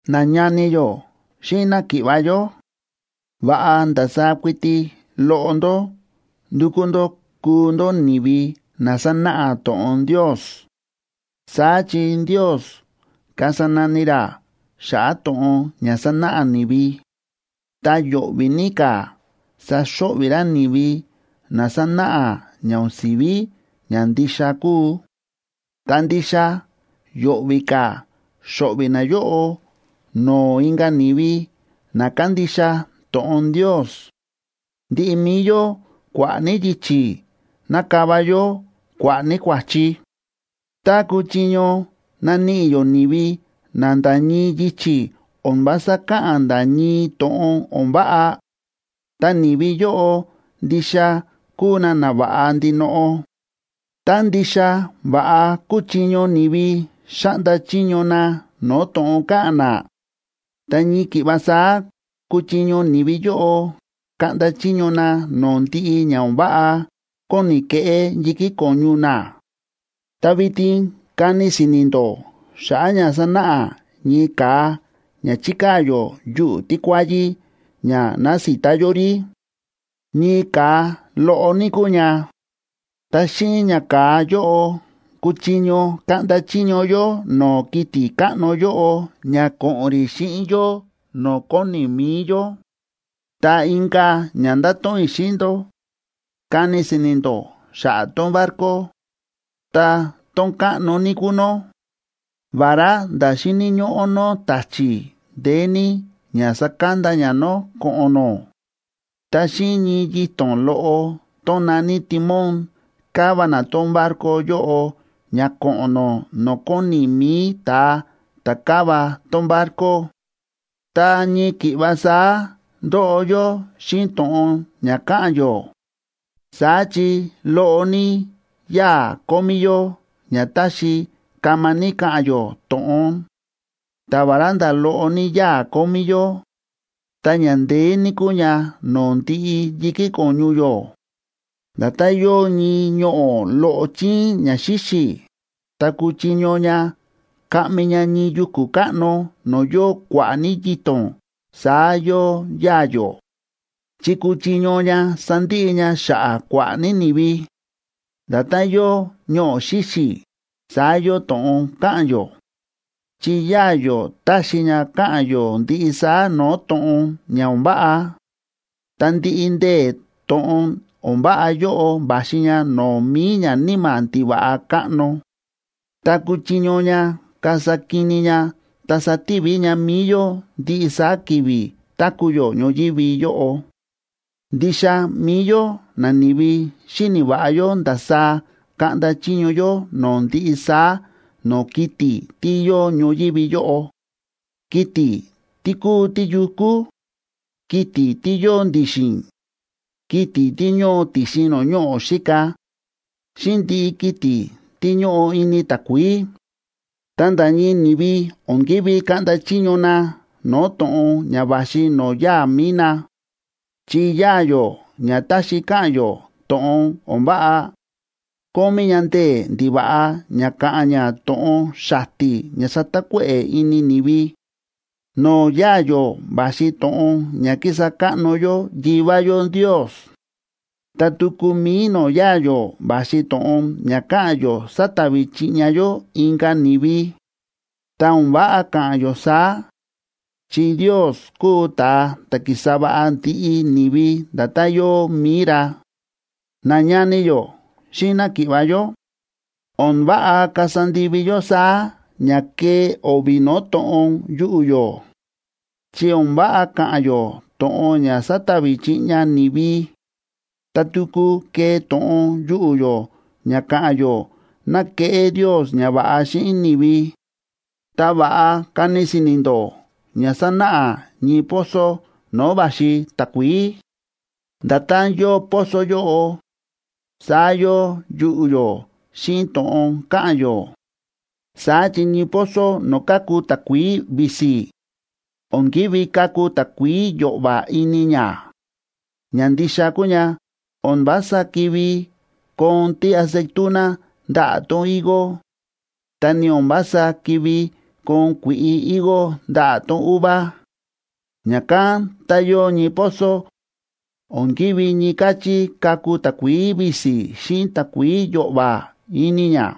Nañani yó xíꞌin náki̱ꞌva̱ yó, va̱ꞌa ndasaá kuiti loꞌo ndó ndukú ndó kuu ndó ni̱vi na sánáꞌa to̱ꞌon Ndios. Saá chi Ndios kasa nani ra xa̱ꞌa̱ to̱ꞌon ña sánáꞌa ni̱vi, ta yo̱ꞌvi̱ ní ka̱ saxo̱ꞌvi̱ ra ni̱vi na sánáꞌa ña o̱n si̱ví ña ndixa kúu, ta ndixa yo̱ꞌvi̱ ka̱ xo̱ꞌvi̱ nayóꞌo no̱o̱ inka̱ ni̱vi na kándixa to̱ꞌon Ndios. Ndiꞌi mi̱i yó kua̱ꞌa̱ ní yichi̱ nákava yó kua̱ꞌa̱ ní kua̱chi. Tá kúchiño naníꞌi yó ni̱vi na nda̱ ñii yichi̱ o̱n vása káꞌa̱n nda̱ ñii to̱ꞌon o̱n váꞌa, ta ni̱vi yóꞌo ndixa kúu na nava̱ꞌa ndinoꞌo. Tá ndixa va̱ꞌa kúchiño ni̱vi xáꞌnda chiño na no̱o̱ to̱ꞌon káꞌa̱n na, ta ñii ki̱ꞌva saá kuchiño ni̱vi yóꞌo kaꞌnda chiño na no̱o̱ ndiꞌi ña o̱n váꞌa kóni keꞌé yi̱kí ko̱ñu na. Ta vitin kani si̱ni̱ ndó xa̱ꞌa̱ ña sánáꞌa ñii ka̱a ña chíkaa̱ yó yuꞌu̱ tíkuáyí ña nasita yó rí. Ñii ka̱a loꞌo ní kúu ña, ta xíꞌin ña ka̱a yóꞌo kúchiño kaꞌnda chiño yó no̱o̱ kiti̱ káꞌno yóꞌo ña ko̱ꞌo̱n rí xíꞌin yó no̱o̱ kóni mi̱i yó. Ta inka̱ ña ndáto̱ꞌon i̱ xíꞌin ndó, kani si̱ni̱ ndó xa̱ꞌa̱ tón barco. Ta tón káꞌno ní kúu nó, vará nda̱ xíni̱ ñóꞌó nó ta̱chi̱ ndeé ní ña sakanda ña nó ko̱ꞌo̱n nó, ta xíꞌin ñii yito̱n loꞌo tón na̱ní timón káva na tón barco yóꞌo ña ko̱ꞌo̱n nó no̱o̱ kóni mi̱i ta̱a ta̱ káva tón barco. Ta ñii ki̱ꞌva saá ndóꞌo yó xíꞌin to̱ꞌon ña káꞌa̱n yó. Saá chi loꞌo ní yáa̱ kómí yó ña táxi kama ní ka̱ꞌa̱n yó to̱ꞌon, ta vará nda̱ loꞌo ní yáa̱ kómí yó, ta ña ndeé ní kúu ña no̱o̱ ndiꞌi yi̱kí ko̱ñu yó. Nda̱tán yóo ñii ñoꞌo̱ loꞌo chíín ña xíxi̱, ta kúchiño ña kaꞌmi ña ñii yuku̱ káꞌno no̱o̱ yóo kua̱ꞌa̱ ní yito̱n, saá yóo yáa̱ yó, chi kúchiño ña sandiꞌi ña xa̱ꞌa̱ kua̱ꞌa̱ ní ni̱vi. Nda̱tán yóo ñoꞌo̱ xíxi̱, saá yóo to̱ꞌon káꞌa̱n yó. Chi yáa̱ yó táxi ña ka̱ꞌa̱n yó ndiꞌi saá no̱o̱ to̱ꞌon ña o̱n váꞌa, ta ndiꞌi ndee̱ to̱ꞌon o̱n váꞌa yóꞌo va̱xi ña no̱o̱ mi̱i ñaníma̱ ndiva̱ꞌa káꞌno, ta kúchiño ña kasa kini ña ta sativi ña mi̱i yó ndiꞌi saá ki̱vi̱ táku̱ yó ñoyívi yóꞌo. Ndixa mi̱i yó nani̱vi xíni̱ va̱ꞌa yó ndasaá kaꞌnda chiño yó no̱o̱ ndiꞌi saá no̱o̱ kiti̱ tí yóo ñoyívi yóꞌo, kiti̱ tí kúu tíyukú, kiti̱ tí yóo ndi̱xi̱n, kiti̱ tí ñóo ti̱xin no̱o̱ ñoꞌo̱ xíka, xíꞌin ndiꞌi kiti̱ tí ñóꞌo ini takuií. Ta nda̱ ñii ni̱vi o̱n ki̱ví kaꞌnda chiño na no̱o̱ to̱ꞌon ña va̱xi no̱o̱ yáa̱ mi̱i na. Chi yáa̱ yó ña táxi ka̱ꞌa̱n yó to̱ꞌon o̱n váꞌa, kómí ña ndee̱ ndiva̱ꞌa ña ka̱ꞌa̱n ña to̱ꞌon xati̱ ña satakuéꞌe̱ ini ni̱vi. No̱o̱ yáa̱ yó va̱xi to̱ꞌon ña kísa káꞌno yó Yivá yó Ndios. Ta tuku mi̱i no̱o̱ yáa̱ yó va̱xi to̱ꞌon ña káꞌa̱n yó satavi chiꞌña yó inka̱ ni̱vi. Ta o̱n váꞌa ka̱ꞌa̱n yó saá, chi Ndios kúu ta̱a ta̱ ki̱sa va̱ꞌa ndiꞌi ni̱vi nda̱tán yóo mi̱i ra. Nañani yó xíꞌin náki̱ꞌva̱ yó, o̱n váꞌa kasa ndivi yó saá ña kée o̱vi̱ no̱o̱ to̱ꞌon yuꞌu̱ yó. Chi o̱n váꞌa ka̱ꞌa̱n yó to̱ꞌon ña satavi chiꞌña ni̱vi, ta tuku kee to̱ꞌon yuꞌu̱ yó ña ka̱ꞌa̱n yó ná keꞌé Ndios ñava̱ꞌa xíꞌin ni̱vi. Ta va̱ꞌa kani si̱ni̱ ndó ña sánáꞌa ñii pozo no̱o̱ va̱xi takuií. Nda̱tán yóo pozo yóꞌo, saá yóo yuꞌu̱ yó xíꞌin to̱ꞌon káꞌa̱n yó. Saá chi ñii pozo no̱o̱ káku takuií visi, o̱n ki̱ví kaku takuií yo̱ꞌva̱ ini ña. Ña ndixa kúu ña, o̱n vása ki̱ví koon tíaceituna ndaꞌa̱ tón higo, ta ni o̱n vása ki̱ví koon kui̱ꞌi higo ndaꞌa̱ tón uva. Ña̱kán tá yóo ñii pozo, o̱n ki̱ví ñii káchí kaku takuií visi xíꞌin takuií yo̱ꞌva̱ ini ña.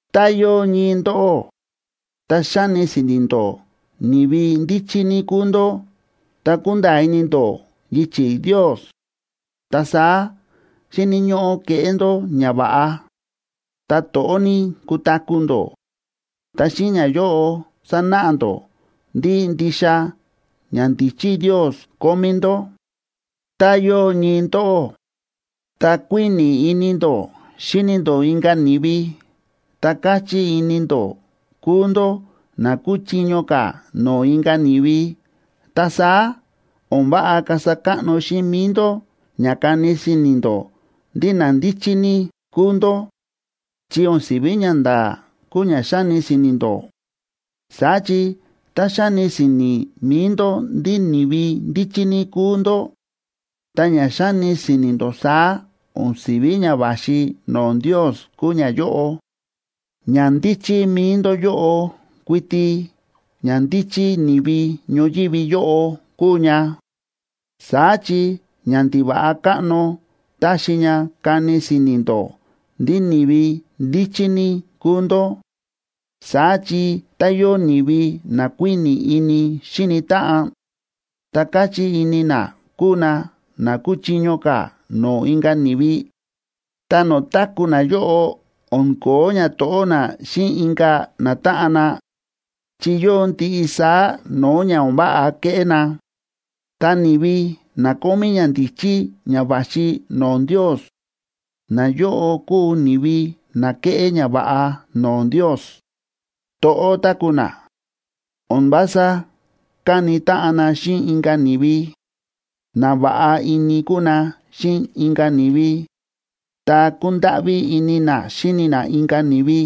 Tá yóo ñii ndóꞌó, ta xáni si̱ni̱ ndó ni̱vi ndíchí ní kúu ndó ta kúnda̱a̱ ini ndó yichi̱ Ndios, ta saá xíni̱ ñóꞌó keꞌé ndó ñava̱ꞌa, ta to̱ꞌó ní kutaku̱ ndó, ta xíꞌin ñayóꞌo sanáꞌa ndó ndí ndixa ñandíchí Ndios kómí ndó. Tá yóo ñii ndóꞌó, ta kuíni̱ ini ndó xíni ndó inka̱ ni̱vi, ta káchí ini ndó kúu ndó na kúchiño ka̱ no̱o̱ inka̱ ni̱vi, ta saá o̱n váꞌa kasa káꞌno xíꞌin mi̱i ndó ña kani si̱ni̱ ndó ndí na ndíchí ní kúu ndó, chi o̱n si̱ví ñanda̱a̱ kúu ña xáni si̱ni̱ ndó. Saá chi tá xáni si̱ni̱ mi̱i ndó ndí ni̱vi ndíchí ní kúu ndó, ta ña xáni si̱ni̱ ndó saá o̱n si̱ví ña va̱xi no̱o̱ Ndios kúu ñayóꞌo, ñandíchí mi̱i ndó yóꞌo kuiti ñandíchí ni̱vi ñoyívi yóꞌo kúu ña, saá chi ñandiva̱ꞌa káꞌno táxi ña kani si̱ni̱ ndó ndí ni̱vi ndíchí ní kúu ndó. Saá chi tá yóo ni̱vi na kuíni̱ ini xíni táꞌan, ta káchí ini na kúu na na kúchiño ka̱ no̱o̱ inka̱ ni̱vi, ta no̱o̱ táku̱ nayóꞌo o̱n ko̱ó ñato̱ꞌó na xíꞌin inka̱ natáꞌan na, chi yóo ndiꞌi saá no̱o̱ ña o̱n váꞌa kéꞌé na. Ta ni̱vi na kómí ñandíchí ña va̱xi no̱o̱ Ndios, nayóꞌo kúu ni̱vi na kéꞌé ñava̱ꞌa no̱o̱ Ndios, to̱ꞌó táku̱ na, o̱n vása káni táꞌan na xíꞌin inka̱ ni̱vi, na va̱ꞌa ini kúu na xíꞌin inka̱ ni̱vi, ta kúndáꞌví ini na xíni na inka̱ ni̱vi,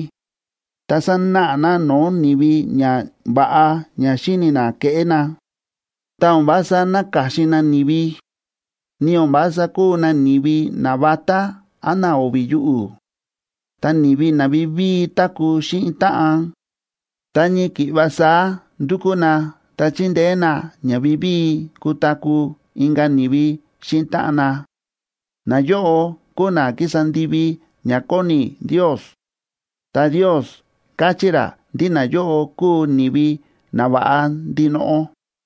ta sánáꞌa na no̱o̱ ni̱vi ñava̱ꞌa ña xíni̱ na keꞌé na, ta o̱n vása náka̱xin na ni̱vi, ni o̱n vása kúu na ni̱vi navatá án na o̱vi̱ yuꞌu̱. Ta ni̱vi na vivíi táku̱ xíꞌin táꞌan, ta ñii ki̱ꞌva saá ndúkú na ta chíndeé na ña vivíi kutaku̱ inka̱ ni̱vi xíꞌin táꞌan na, nayóꞌo kúu na kísa ndivi ña kóni Ndios, ta Ndios káchí ra ndí nayóꞌo kúu ni̱vi nava̱ꞌa ndinoꞌo.